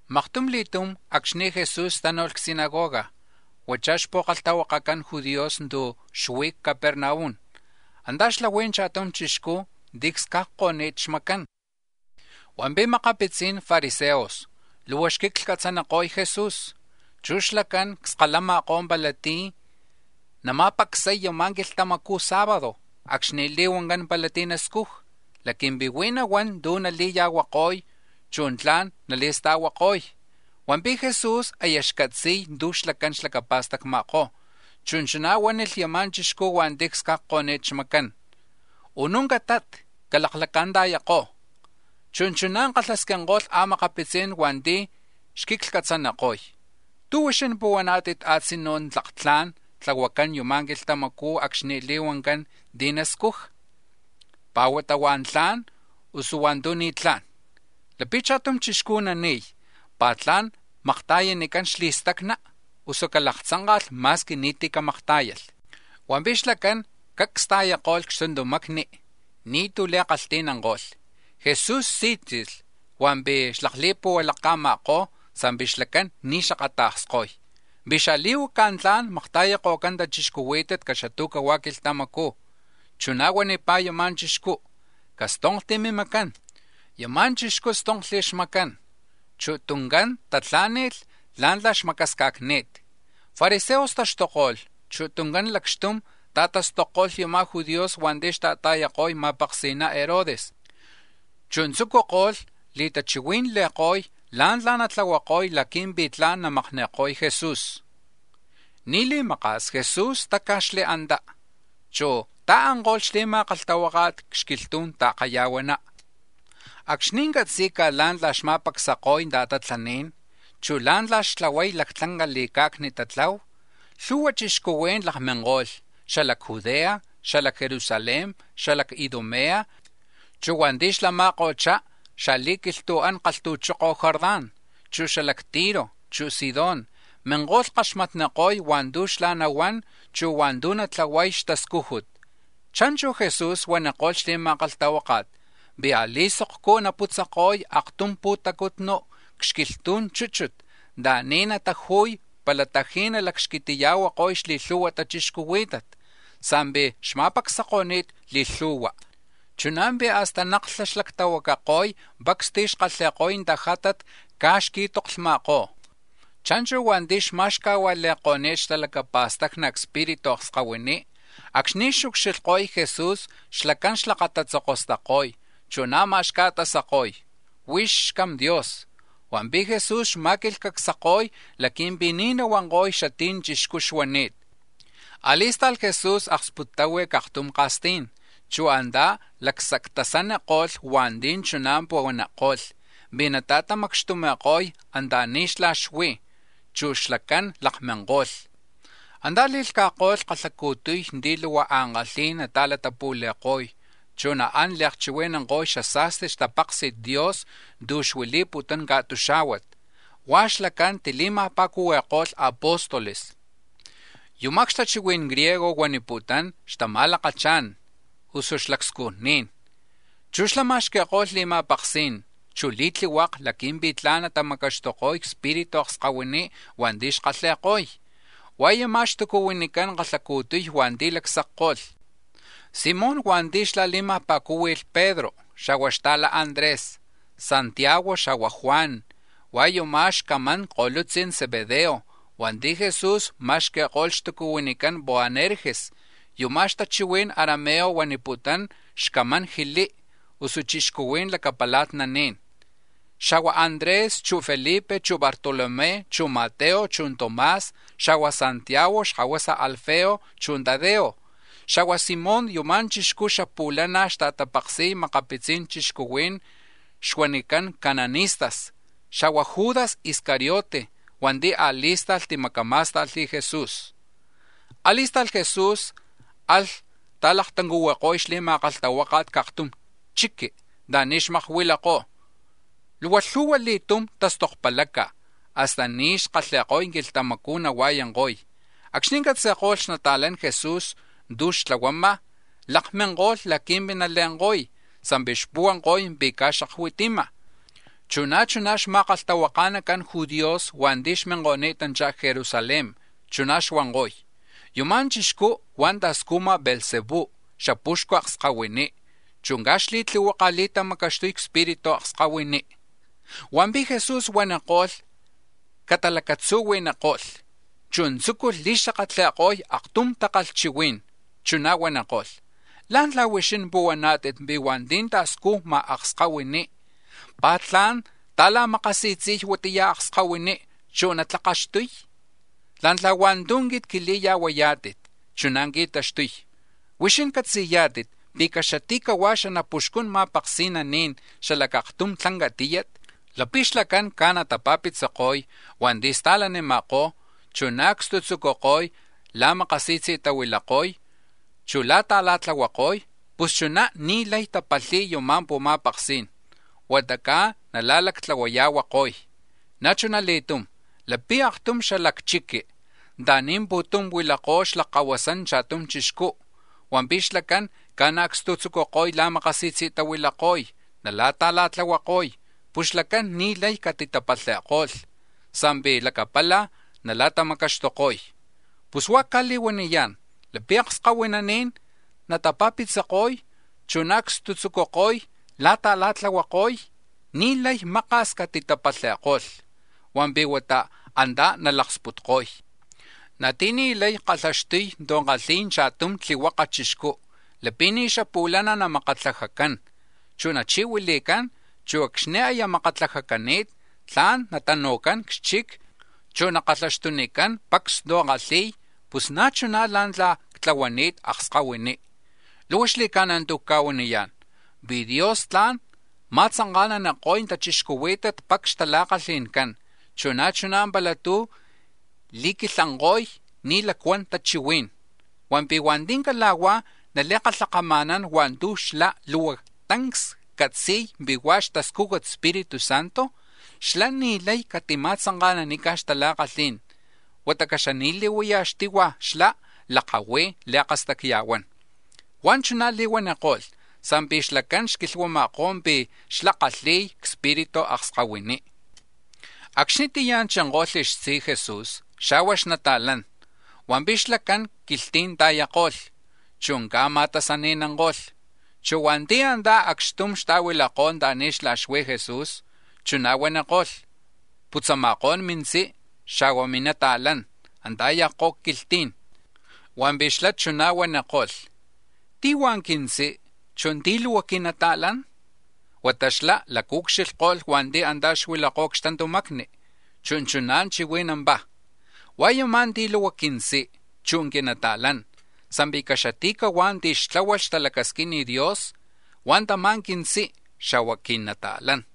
Maktum li̱tum, acxni̱ Jesús tánu̱lh c-sinagoga huachá̱ xpu̱kalhtahuakacan judíos tu̱ xuí̱ c-Capernaum, antá̱ xlahui̱ cha̱tum chixcú̱ ti̱ csca̱cniko̱ni̱t xmacán. Hua̱mpi̱ makapitzi̱n fariseos luhua xquiclhcatzaniko̱y Jesús, chu̱ xlacán cskalama̱kó̱ pala tí̱ nama̱pacsay yama̱ quilhtamacu̱ sábado acxni̱ li̱huancán pala tí̱ nascuja, laqui̱mpi̱ huij nahuán tu̱ nali̱ya̱huako̱y, chu̱ tla̱n nali̱sta̱huako̱y. Hua̱mpi̱ Jesús aya xcatzi̱y tu̱ xlacán xlacapa̱stacma̱kó̱, chu̱ chuná̱ huánilh yama̱ chixcú̱ hua̱nti̱ csca̱cko̱ni̱t xmacán: —Unú̱ catat, calaklacanta̱yako. Chu̱ chuná̱ kalhasquinko̱lh a̱makapitzí̱n hua̱nti̱ xquiclhcatzaniko̱y: —¿Tú̱ huixín puhuaná̱tit a̱tzinú̱ tlak tla̱n tlahuacán yuma̱ quilhtamacú̱ acxni̱ li̱huancán ti̱ nascuja, pá̱ huata hua̱ntu̱ tla̱n, usuchí̱ hua̱ntu̱ ni̱tlá̱n? Lapi̱ cha̱tum chixcú̱ nani̱y, ¿pi̱ tla̱n makta̱yanicán xli̱stacna, usuchí̱ calaktzanka̱ka̱lh ma̱squi ni̱tí̱ camaktá̱yalh? Hua̱mpi̱ xlacán cacs ta̱yako̱lh c-xtuntamacni, ni̱tú̱ li̱kalhti̱nanko̱lh. Jesús sí̱tzi̱lh hua̱mpi̱ xlakli̱puhualaca̱ma̱kó̱ sa̱mpi̱ xlacán ni̱ xakata̱ksko̱y pi̱ xali̱huaca̱ tla̱n namakta̱yako̱cán tachixcuhuí̱tat caxatu̱cahua̱ quilhtamacú̱. Chuná̱ huanipá̱ yama̱ chixcú: —Castonkti̱ mimacán. Yama̱ chixcú̱ stonkli̱ xmacán, chu̱ tuncán tatlá̱ni̱lh la̱ntla̱ xmacasca̱cni̱t. Fariseos taxtuko̱lh, chu̱ tuncán lacxtum ta̱tastokko̱lh yama̱ judíos hua̱nti̱ xta̱ta̱yako̱y ma̱paksi̱na Herodes, chu̱ tzucuko̱lh li̱tachihui̱nli̱ko̱y la̱ntla̱ natlahuako̱y laqui̱mpi̱ tla̱n namakni̱ko̱y Jesús. Ni̱ li̱maka̱s Jesús táca̱xli̱ antá, chu̱ ta̱anko̱lh xli̱ma̱kalhtahuáka̱t c-xquilhtu̱n ta̱kaya̱huaná. Acxni̱ catzi̱ca̱ la̱ntla̱ xma̱pacsako̱y tatatlaní̱n, chu̱ la̱ntla̱ xtlahuay lactlanca li̱ca̱cni tatlahu, lhu̱hua chixcuhuí̱n lakminko̱lh, xala c-Judea, xala c-Jerusalén, xala c-Idumea, chu̱ hua̱nti̱ xlama̱ko̱chá̱ xa̱li̱quilhtu̱an kalhtu̱choko̱ Jordán, chu̱ xala c-Tiro, chu̱ Sidón; minko̱lh kaxmatniko̱y hua̱ntu̱ xlá̱ nahuán, chu̱ hua̱ntu̱ natlahuay xtascújut. Cha̱nchu̱ Jesús huaniko̱lh xli̱ma̱kalhtahuáka̱t pi̱ a̱li̱sokcú̱ naputzako̱y aktum pu̱tacutnu̱ c-xquilhtu̱n chúchut anta̱ni̱ nataju̱y pala ta̱ji̱ nalacxquitiya̱huako̱y xli̱lhu̱hua tachixcuhuí̱tat. Sa̱mpi̱ xma̱pacsako̱ni̱t li̱lhu̱hua, chuná̱ pi̱ hasta naklha xlactahuacako̱y pacs ti̱ xkalhi̱ko̱y tajátat caj xqui̱toklhma̱kó̱. Cha̱nchu̱ hua̱nti̱ xma̱xcajua̱li̱ko̱ni̱t xtalacapa̱stacni cspiritu akskahuiní, acxni̱ xucxilhko̱y Jesús xlacán xlakatatzokostako̱y, chu̱ na̱má̱ xca̱tasako̱y: —Huix xCam Dios. Hua̱mpi̱ Jesús xma̱quilhcacsako̱y laqui̱mpi̱ ni̱ nahuanko̱y xatí̱ ya̱ chixcú xuani̱t. A̱li̱sta̱lh Jesús aksputtahui̱ c-aktum ka̱stí̱n, chu̱ antá̱ lacsactasaniko̱lh hua̱nti̱ chuná̱ puhuaniko̱lh pi̱ natamacxtumi̱ko̱y anta̱ni̱ xlá̱ xuí̱, chu̱ xlacán lakminko̱lh. Antá̱ li̱lhca̱ko̱lh kalhacu̱tuy ti̱ luhua ankalhí̱n nata̱latapu̱li̱ko̱y, chu̱ naán li̱chihui̱nanko̱y xasa̱sti xtapaksi̱t Dios tu̱ xuili̱putún ca̱tuxá̱huat. Hua̱ xlacán tili̱ma̱pa̱cuhui̱ko̱lh xapóstoles. (Yuma̱ c-xatachihui̱n griego huaniputún “xtama̱lakachá̱n” usu “xlacscujní̱n”.) Chu̱ xlá̱ ma̱xqui̱ko̱lh li̱ma̱paksí̱n, chu̱ li̱tlihuaka̱ laqui̱mpi̱ tla̱n natamacaxtuko̱y cspiritu akskahuiní̱ hua̱nti̱ xkalhi̱ko̱y. Hua̱ yumá̱ xtucuhuinican kalhacu̱tuy hua̱nti̱ lacsacko̱lh: Simón hua̱nti̱ xlá̱ li̱ma̱pa̱cúhui̱lh Pedro, xa̱hua̱ xta̱lá̱ Andrés; Santiago, xa̱hua̱ Juan, hua̱ yumá̱ xcamán ko̱lutzi̱n Zebedeo, chu̱ hua̱nti̱ Jesús ma̱xqui̱ko̱lh xtucuhuinicán Boanerges. (Yuma̱ c-xatachihui̱n arameo huaniputún “Xcaman Jilí”, usu “Chixcuhuí̱n Lacapala̱tnaní̱n”); Xa̱hua̱ Andrés, chu̱ Felipe, chu̱ Bartolomé, chu̱ Mateo, chu̱ Tomás; xa̱hua̱ Santiago xkahuasa Alfeo; chu̱ Tadeo; xa̱hua̱ Simón, (yuma̱ chixcú̱ xapu̱lana̱ xta̱tapaksi̱y makapitzi̱n chixcuhuí̱n xuaniko̱cán cananistas); xa̱hua̱ Judas Iscariote, hua̱nti̱ a̱li̱sta̱lh timacamá̱sta̱lh Jesús. A̱li̱sta̱lh Jesús alh ta̱laktuncuhuiko̱y xli̱ma̱kalhtahuáka̱t c-aktum chiqui̱ anta̱ni̱ xmakuilakó̱. Luhua lhu̱hua li̱tum tastokpalaca̱, hasta ni̱ xkalhi̱ko̱y quilhtamacú̱ nahua̱yanko̱y. Acxni̱ catzi̱ko̱lh xnata̱lan Jesús tu̱ xtlahuama̱, lakminko̱lh laqui̱mpi̱ nale̱nko̱y, sa̱mpi̱ xpuhuanko̱y pi̱ caj ni̱ xaccatzi̱y. Chu̱ na̱ chuná̱ xma̱kalhtahuaka̱nacan judíos hua̱nti̱ xminko̱ni̱tanchá̱ c-Jerusalén, chuná̱ xuanko̱y: “Yuma̱ chixcú huá̱ ta̱scujma̱ Beelzebú xapuxcu akskahuiní, chu̱ caj xli̱tlihuaka̱ li̱tamacaxtuy cspiritu akskahuiní.” Hua̱mpi̱ Jesús huaniko̱lh catalacatzuhui̱niko̱lh, chu̱ tzúculh li̱xakatli̱ko̱y aktum takalhchihuí̱n, chuná̱ huaniko̱lh: “¿Lá̱ntla̱ huixín puhuaná̱tit pi̱ hua̱nti̱ ta̱scujma̱ akskahuiní, pa̱ tla̱n ta̱la̱makasi̱tzi̱y huatiya akskahuiní, chu̱ natlakaxtuy? La̱ntla̱ hua̱ntu̱ quit quili̱ya̱huayá̱tit, chuná̱ qui̱taxtuy: Huixín catzi̱yá̱tit pi̱ caxati̱cahua̱ xanapuxcun ma̱paksi̱naní̱n xala c-aktum tlanca tíyat, lapi̱ xlacán caj natapa̱pitziko̱y hua̱nti̱ sta̱lanima̱kó̱, chu̱ naacstutzucuko̱y la̱makasi̱tzi̱tahuilako̱y, chu̱ la̱ta̱la̱tlahuako̱y, pus chuná̱ ni̱ lay tapalhi̱y yama̱ pu̱ma̱paksí̱n, huata caj nala̱lactlahuaya̱huako̱y. Na̱ chuna li̱tum, lapi̱ aktum xala c-chiqui̱ anta̱ni̱ pu̱tum huilakó̱ xlakkahuasan cha̱tum chixcú, hua̱mpi̱ xlacán caj naacstutzucuko̱y la̱makasi̱tzi̱tahuilako̱y la̱ta̱la̱tlahuako̱y, pus xlacán ni̱ lay catitapalhi̱ko̱lh sa̱mpi̱ lacapala̱ nala̱tamacaxtuko̱y. Pus huá̱ cca̱li̱huaniyá̱n, lapi̱ akskahuinín natapa̱pitziko̱y, chu̱ naacstutzucuko̱y la̱ta̱la̱tlahuako̱y, ni̱ lay maka̱s catitapalhi̱ko̱lh, hua̱mpi̱ huata antá̱ nalaksputko̱y. “Na̱ ti̱ni̱ lay kalhaxtuy tu̱ kalhi̱y cha̱tum tlihuaka chixcú lapi̱ ni̱ xapu̱lana̱ namakatlajacán, chu̱ nachi̱huili̱cán, chu̱ acxni̱ aya makatlajacani̱t, tla̱n natanu̱cán c-xchic, chu̱ nakalhaxtunicán pacs tu̱ kalhi̱y, pus na̱ chuná̱ la̱ntla̱ quit ctlahuani̱t akskahuiní. “Luhua xli̱ca̱na̱ tu̱ cca̱huaniyá̱n, pi̱ Dios tla̱n ma̱tzanka̱naniko̱y tachixcuhuí̱tat pacs xtala̱kalhi̱ncán, chu̱ na̱ chuná̱ pala tú̱ li̱quilhanko̱y ni̱ lacuan tachihuí̱n. Hua̱mpi̱ hua̱nti̱ cala̱huá̱ nali̱kalhkama̱nán hua̱ntu̱ xlá̱ luhua tancs catzi̱y pi̱ huá̱ xtascujut Espíritu Santo, xlá̱ ni̱ lay catima̱tzanka̱nanica̱ xtala̱kalhí̱n huata caxani̱li̱huayaj xtihua̱ xlá̱ lakahui̱ li̱akastacya̱huán.” Huá̱ chuná̱ li̱huaniko̱lh sa̱mpi̱ xlacán xquilhuama̱kó̱ pi̱ xlá̱ xkalhi̱y cspiritu akskahuiní. Acxnitiyá̱ chinko̱lh xtzi Jesús, xa̱hua̱ xnata̱lán, hua̱mpi̱ xlacán quilhtí̱n ta̱yako̱lh, chu̱ caj ma̱tasani̱nanko̱lh. Chu̱ hua̱nti̱ antá̱ acxtum xta̱huilakó̱ anta̱ni̱ xlá̱ xuí̱ Jesús, chuná̱ huaniko̱lh: —Putzama̱kó̱n mintzí, xa̱hua̱ mili̱nata̱lán, antá̱ ya̱kó̱ quilhtí̱n. Hua̱mpi̱ xlá̱ chuná̱ huaniko̱lh: —¿Tí̱ hua̱ quintzí, chu̱ tí̱ luhua quinata̱lán? Huata xlá̱ lacaucxilhko̱lh hua̱nti̱ antá̱ xuilakó̱ c-xtuntamacni, chu̱ chuná̱ chihui̱nampá̱: —Hua̱ yumá̱ ti̱ luhua quintzí, chu̱ quinata̱lán. Sa̱mpi̱ caxati̱cahuá̱ ti̱ xtláhualh xtalacasquin Dios, hua̱ tamá̱ quintzí, xa̱hua̱ quinata̱lán.